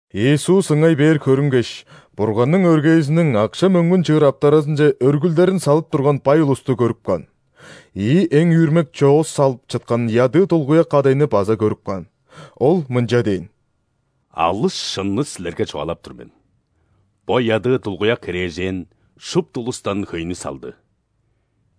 Иисус ыңай-бээр көрүнгеш, Бурганның өргээзиниң акша-мөңгүн чыыр аптаразынче өргүлдерин салып турган бай улусту көрүп каан. Ийи эң үүрмек чоос салып чыткан ядыы дулгуяк кадайны база көрүп каан. Ол мынча дээн: «Алыс шынны силерге чугаалап тур мен, бо ядыы дулгуяк херээжен шупту улустан хөйнү салды.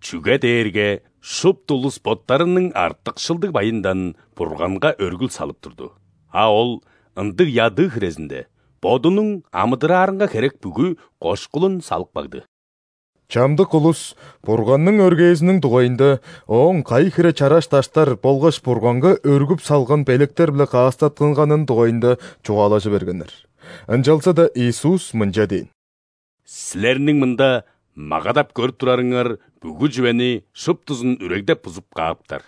Чүге дээрге шупту улус боттарының артыкшылдыг байындан Бурганга өргүл салып турду, а ол, ындыг ядыы хирезинде, бодунуң амыдыраарынга херек бүгү кошкулун салып кагды». Чамдык улус Бурганның өргээзиниң дугайында, ооң кайы хире чараш даштар болгаш Бурганга өргүп салган белектер-биле каастаттынганының дугайында чугаалажы бергеннер. Ынчалза-даа Иисус мынча дээн: «Силерниң мында магадап көрүп турарыңар бүгү чүвени шуптузун үрегдеп-бузуп кааптар.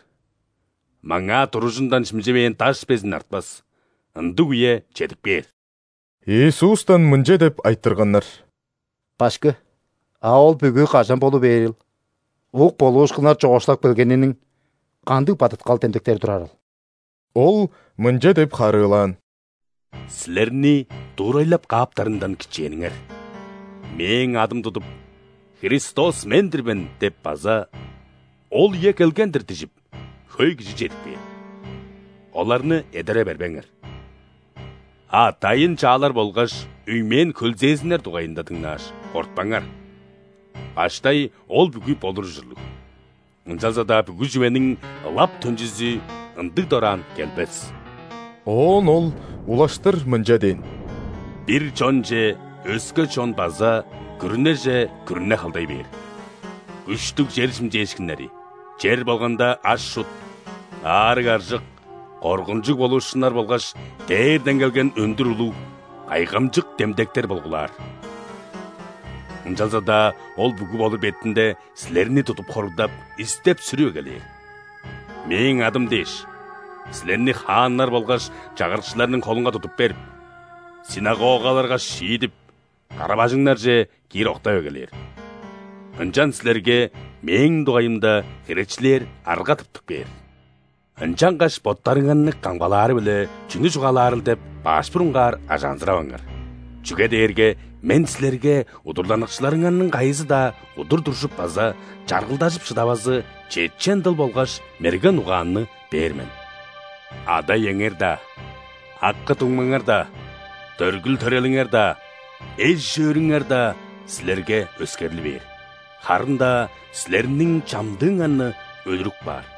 Маңаа туружундан шимчевээн даш безин артпас – ындыг үе чедип кээр». Иисустан мынча деп айтырганнар: «Башкы, а ол бүгү кажан болу бээрил? Ук болуушкуннар чоокшулап келгениниң кандыг бадыткал демдектери турарыл?» Ол мынча деп харыылаан: «Силерни дуурайлап кааптарындан кичээниңер, Мээң адым тудуп: „Христос – мен-дир мен“ – деп база „Ол үе келген-дир“ – дижип, хөй кижи чедип кээр. Оларны эдере бербеңер. А дайын-чаалар болгаш үймээн-хөлзээзиннер дугайында дыңнааш, кортпаңар, баштай ол бүгү болур ужурлуг, ынчалза-даа бүгү чүвениң ылап төнчүзү ындыг дораан келбес». Оон Ол улаштыр мынча дээн: «Бир чонче өске чон база күрүнеже күрүне халдай бээр. Күштүг чер шимчээшкиннери, чер болганга аш-чут, аарыг-аржык, коргунчуг болуушкуннар болгаш дээрден келген өндүр улуг, кайгамчык демдектер болгулаар. Ынчалза-даа ол бүгү болур бетинде, силерни тудуп хоругдап, истеп-сүрүп эгелээр. Мээң адым дээш, силерни хааннар болгаш чагырыкчыларның холунга тудуп берип, ·синагогаларга шиидип, кара-бажыңнарже киир октап эгелээр. Ынчан силерге Мээң дугайымда херечилээр арга тыптып кээр. Ынчангаш боттарыңарны камгалаары-биле чүнү чугаалаарыл деп, баш бурунгаар ажаанзыраваңар. Чүге дээрге Мен силерге удурланыкчыларыңарның кайызы-даа удур туржуп база чаргылдажып шыдавазы чечен дыл болгаш мерген угаанны бээр мен. Ада-иеңер-даа, акы-дуңмаңар-даа, дөргүл-төрелиңер-даа, эш-өөрүңер-даа силерге өскерли бээр, харын-даа силерниң чамдыыңарны өлүрүп каар.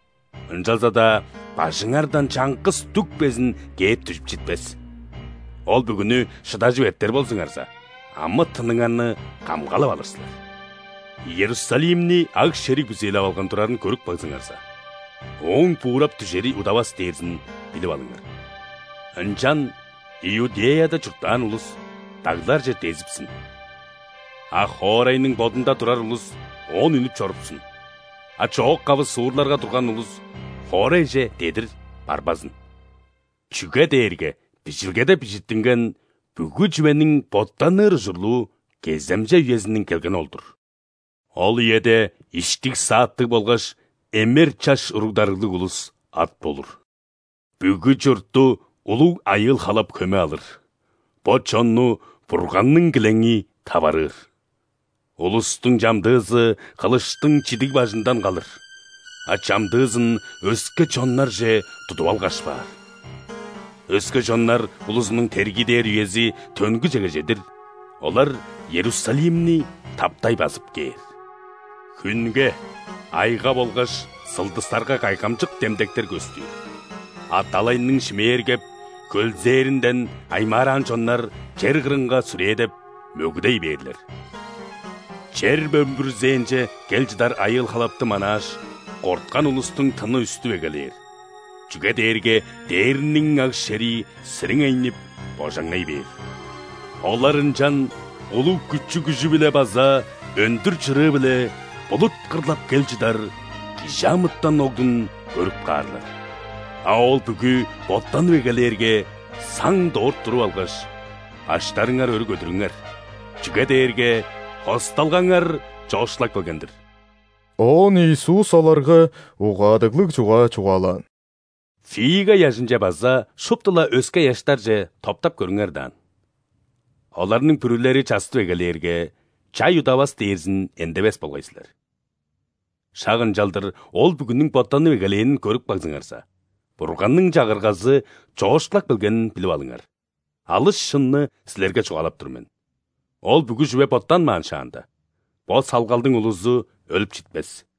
Ынчалза-даа бажыңардан чаңгыс дүк безин кээп дүжүп читпес. Ол бүгүнү шыдажып эртер болзуңарза, амы-тыныңарны камгалап алыр силер». «Иерусалимни аг-шериг бүзээлеп алган турарын көрүп кагзыңарза, ооң буурап дүжери удавас дээрзин билип алыңар. Ынчан Иудеяда чурттаан улус дагларже дезипсин; а хоорайның бодунда турар улус оон үнүп чорупсун; а чоок-кавы суурларга турган улус хоорайже дедир барбазын. Чүге дээрге Бижилгеде бижиттинген бүгү чүвениң боттаныр ужурлуу кеземче үезиниң келгени ол-дур. Ол үеде иштиг-сааттыг болгаш эмер чаш уруг-дарыглыг улус ат болур! Бүгү чуртту улуг айыыл-халап хөме алыр, бо чонну Бурганның килеңи таварыыр. Улустуң чамдыызы хылыштың чидиг бажындан калыр, а чамдыызын өске чоннарже тудуп алгаш баар. Өске чоннар улузунуң тергиидээр үези төнгүжеге чедир, олар Иерусалимни таптай базып кээр». «Хүнге, айга болгаш сылдыстарга кайгамчык демдектер көстүр, а далайның шимээргеп, хөлзээринден аймаараан чоннар чер кырынга сүрээдеп, мөгүдей бээрлер. Чер бөмбүрзээнче кел чыдар айыыл-халапты манааш, корткан улустуң тыны үстүп эгелээр, чүге дээрге дээрниң аг-шерии сириңейнип, божаңнай бээр. Олар ынчан улуг күчү-күжү-биле база өндүр чырыы-биле булут кырлап кел чыдар ·Кижи амытан Оглун көрүп каарлар. А ол бүгү боттанып эгелээрге, саң дорт туруп алгаш, баштарыңар өрү көдүрүңер, чүге дээрге хосталгаңар чоокшулап келген-дир». Оон Иисус оларга угаадыглыг чугаа чугаалаан: «Фига ыяжынче база шупту-ла өске ыяштарже топтап көрүңер даан: оларның бүрүлери частып эгелээрге, чай удавас дээрзин эндевес болгай силер. Шак ынчалдыр, ол бүгүнүң боттанып эгелээнин көрүп кагзыңарза, Бурганның Чагыргазы чоокшулап келгенин билип алыңар. Алыс шынны силерге чугаалап тур мен: ол бүгү чүве боттанмаан шаанда, бо салгалдың улузу өлүп читпес.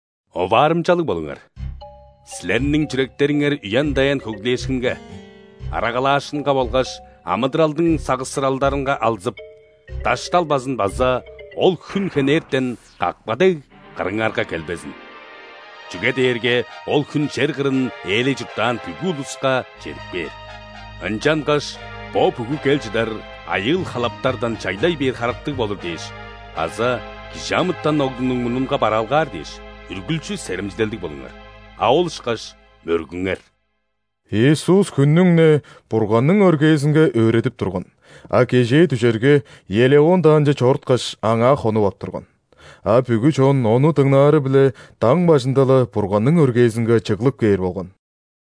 «Оваарымчалыг болуңар: силерниң чүректериңер үен-даян хөглээшкинге, арагалаашкынга болгаш амыдыралдың сагышсыралдарынга алзып, дашталбазын база ол хүн хенертен, какпа дег, кырыңарга келбезин. Чүге дээрге ол хүн чер кырын ээлей чурттаан бүгү улуска чедип кээр. Ынчангаш бо бүгү кел чыдар айыыл-халаптардан чайлай бээр харыктыг болур дээш база ·Кижи амытан Оглунуң мурнунга бараалгаар дээш, үргүлчү серемчилелдиг болуңар, а ол ышкаш мөргүңер». Иисус хүннүң-не Бурганның өргээзинге өөредип турган, а кежээ дүжерге, Елеон даанче чоруткаш, аңаа хонуп ап турган. А бүгү чон Ону дыңнаары-биле даң бажында-ла Бурганның өргээзинге чыглып кээр болган.